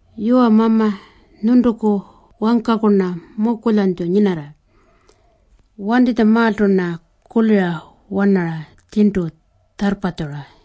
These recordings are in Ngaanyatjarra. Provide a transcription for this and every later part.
Yuwa Mama, nyuntuku wangkaku-rna mukulyanytju nyinarra. Wantinytjamaaltu-rna kulira-wanara tjirntu tjarrpatjura.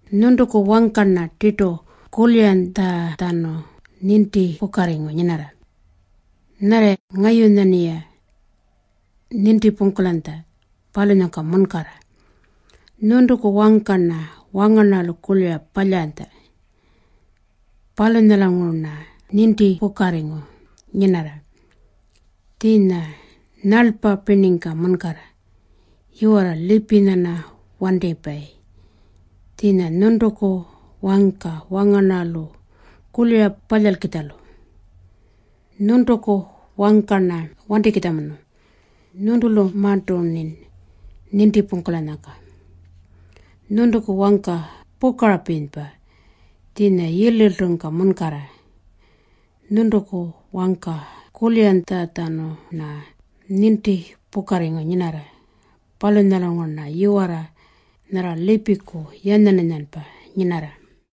Nyuntuku wangka-rna tirtu kuliranytjatjanu nintipukarringu nyinarra, nyarra ngayunya-rniya nintipungkulanytja, palunyangka munkarra. Nyuntuku wangka-rna wangarnarralu kulira palyaranytja. Palunyalanguru-rna nintipukarringu nyinarra, tjiinya nyalpa pirningka munkarra. Yiwarra lipinya-rna wantipayi tjiinya nyuntuku wangka wangarnarralu kulira palyalkitjalu. Nyuntuku wangka-rna wantikitjamunu. Nyuntulumarntu-rnin nintipungkulanyangka. Nyuntuku wangka pukarapirinypa tjiinya yirliltungka munkarra. Nyuntuku wangka kuliranytjatjanu-rna nintipukarringu nyinarra. Palunyalanguru-rna yiwarra nyarra lipiku yanyan-yanyanpa nyinarra.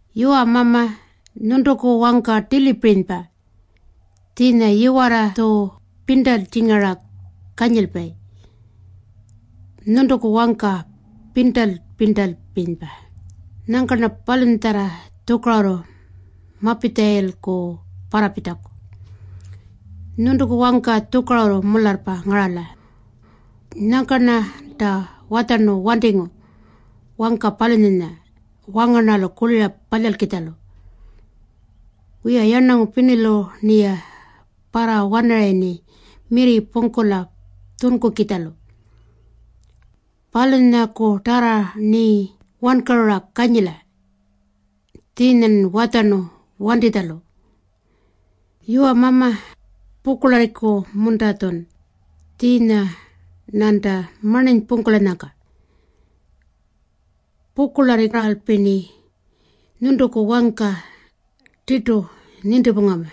Yuwa Mama, nyuntuku wangka tilipirinypa tjiinya yiwarra-tju pirntaltjingara kanyilpayi. Nyuntuku wangka pirntal-pirntalpirinypa. Nyangka-rna palunyatjarra tjukarurru mapitjalayilku parrapitjaku. Nyuntuku wangka tjukarurru mularrpa ngarala. Nyangka-rnanta watjarnu wantingu wangka palunyanya wangarnarralu kulira palyalkitjalu. Wiya, yarnangu pirnilu-rniya parrawanarayirni mirri pungkula tjunkukitjalu. Palunyakutarra-rni wankarura kanyila, tjiinya-rnin watjarnu wantitjalu. Yuwa Mama, pukurlarriku-munta-tjun tjiinya-rnanta marninypungkulanyangka? Pukurlarrirralpi-rni nyuntuku wangka tirtu nintipungama.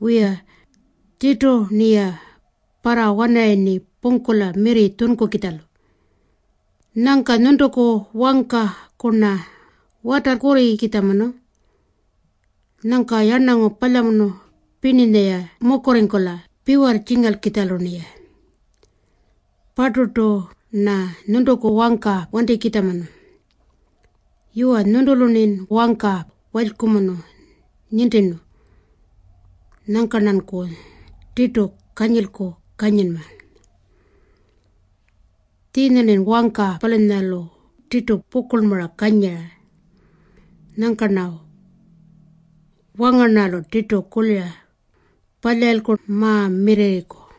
Wiya, tirtu-rniya parrawanarayirni pungkula mirri tjunkukitjalu. Nyangka nyuntuku wangkaku-rna watarrkurrikitjamunu. Nyangka yarnangu palyamunu pirninya-ya mukurringkula piwarrtjingalkitjalu-rniya. Parturtu-rna nyuntuku wangka wantikitjamunu. Yuwa, nyuntulu-rnin wangka walykumunu nintirnu. Nyangka-rnanku tirtu kanyilku kanyinma. Tjiinya-rni wangka palunyalu tirtu pukurlmara kanyira. Nyangka-rna wangarnarralu kulira palyarayilku ma-mirrirriku.